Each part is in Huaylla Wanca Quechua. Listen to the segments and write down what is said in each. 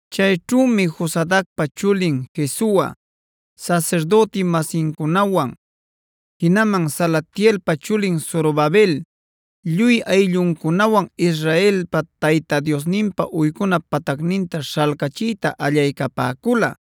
Chayćhümi Josadacpa chulin Jesua sasirdüti-masincunawan, jinaman Salatielpa chulin Zorobabel lluy aylluncunawan Israelpa Tayta Diosninpa uycuna patacninta śhalcachiyta allaycapäcula,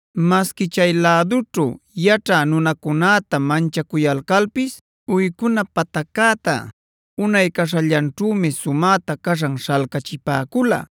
Masqui chay lädućhu yaćhä nunacunäta manchacuyalcalpis uycuna pataccäta unay caśhallanćhümi sumäta caśhan śhalcachipäcula.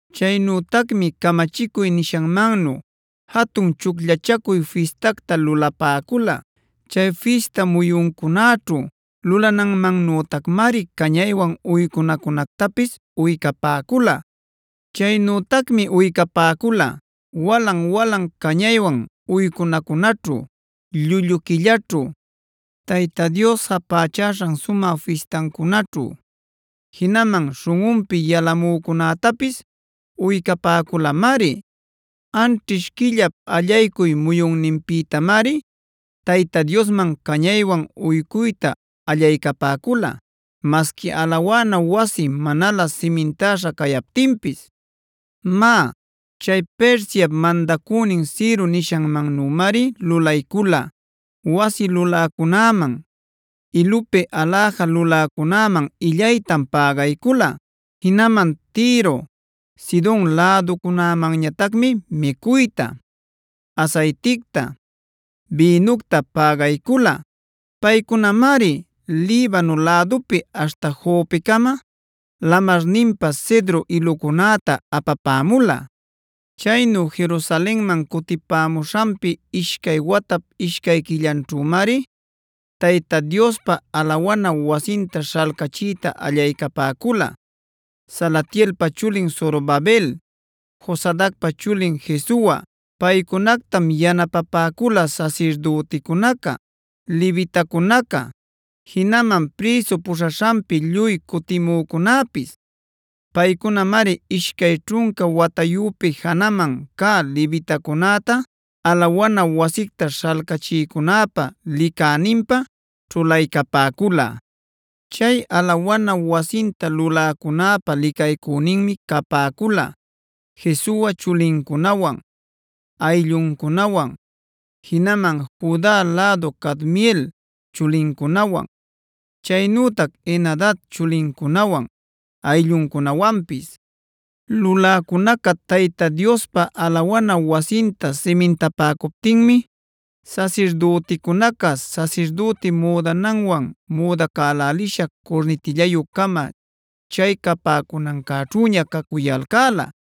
Chaynütacmi camachicuy nishanmannu jatun Chucllachacuy Fistactad lulapäcula. Chay fista muyuncunaćhu lulananmannütacmari cañaywan uycunacunactapis uycapäcula. Chaynütacmi uycapäcula: walan-walan cañaywan uycunacunaćhu, llullu quillaćhu, Tayta Dios japächaśhan sumä fistancunaćhu,e jinaman śhunꞌunpi yalamücunätapis uycapäculamari. Anćhish quillap allaycuy muyunninpïtamari Tayta Diosman cañaywan uycuyta allaycapäcula masqui alawana wasi manalä simintäśha cayaptinpis. Má, chay Persiap mandacünin Ciro nishanmannümari lulaycula. Wasi luläcunäman, ilupi aläja luläcunäman illaytam pägaycula. Jinaman Tiro, Sidon läducunämanñatacmi micuyta, asayticta, bïnucta pägaycula. Paycunamari Libano lädupi aśhta Jopecama lamarninpa cedro ilucunäta apapämula. Chaynu Jerusalenman cutipämuśhanpi ishcay watap ishcay quillanćhümari Tayta Diospa alawana wasinta śhalcachiyta allaycapäcula Salatielpa chulin Zorobabel, Josadacpa chulin Jesua. Paycunactam yanapapäcula sasirdüticunaca, levitacunaca, jinaman prïsu puśhaśhanpi lluy cutimücunäpis. Paycunamari ishcay ćhunca watayüpi janaman cä levitacunäta alawana wasicta śhalcachïcunäpa licäninpä ćhulaycapäcula. Chay alawana wasinta luläcunäpa licaycüninmi capäcula Jesua chulincunawan, aylluncunawan, jinaman Juda lädu Cadmiel chulincunawan, chaynütac Henadad chulincunawan, aylluncunawanpis. Luläcunaca Tayta Diospa alawana wasinta simintapäcuptinmi sasirdüticunaca sasirdüti müdananwan müdacälälisha curnitillayü-cama chay capäcunancäćhüña cacuyalcäla.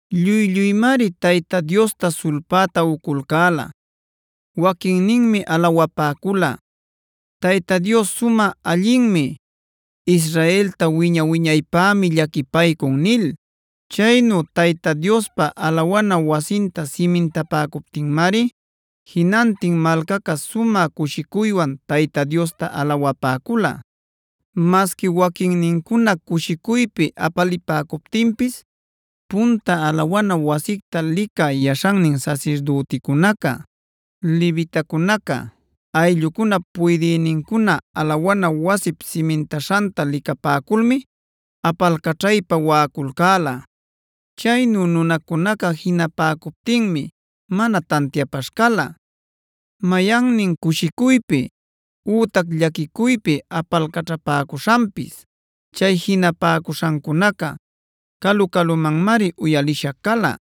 Lluy-lluymari Tayta Diosta sulpäta uculcäla. Waquinninmi alawapäcula: “Tayta Dios sumä allinmi. Israelta wiña-wiñaypämi llaquipaycun” nil.g Chaynu Tayta Diospa alawana wasinta simintapäcuptinmari jinantin malcaca sumä cushicuywan Tayta Diosta alawapäcula. Masqui waquinnincuna cushicuypi apalipäcuptinpis, punta alawana wasicta licä yaśhannin sasirdüticunaca, levitacunaca, ayllucunap puydïnincuna alawana wasip simintaśhanta licapäculmi apalcaćhaypa waꞌaculcäla. Chaynu nunacunaca jinapäcuptinmi mana tantiapaśh cala, mayannin cushicuypi ütac llaquicuypi apalcaćhapäcuśhanpis. Chay jinapäcuśhancunaca calu-calumanmari uyalisha cala.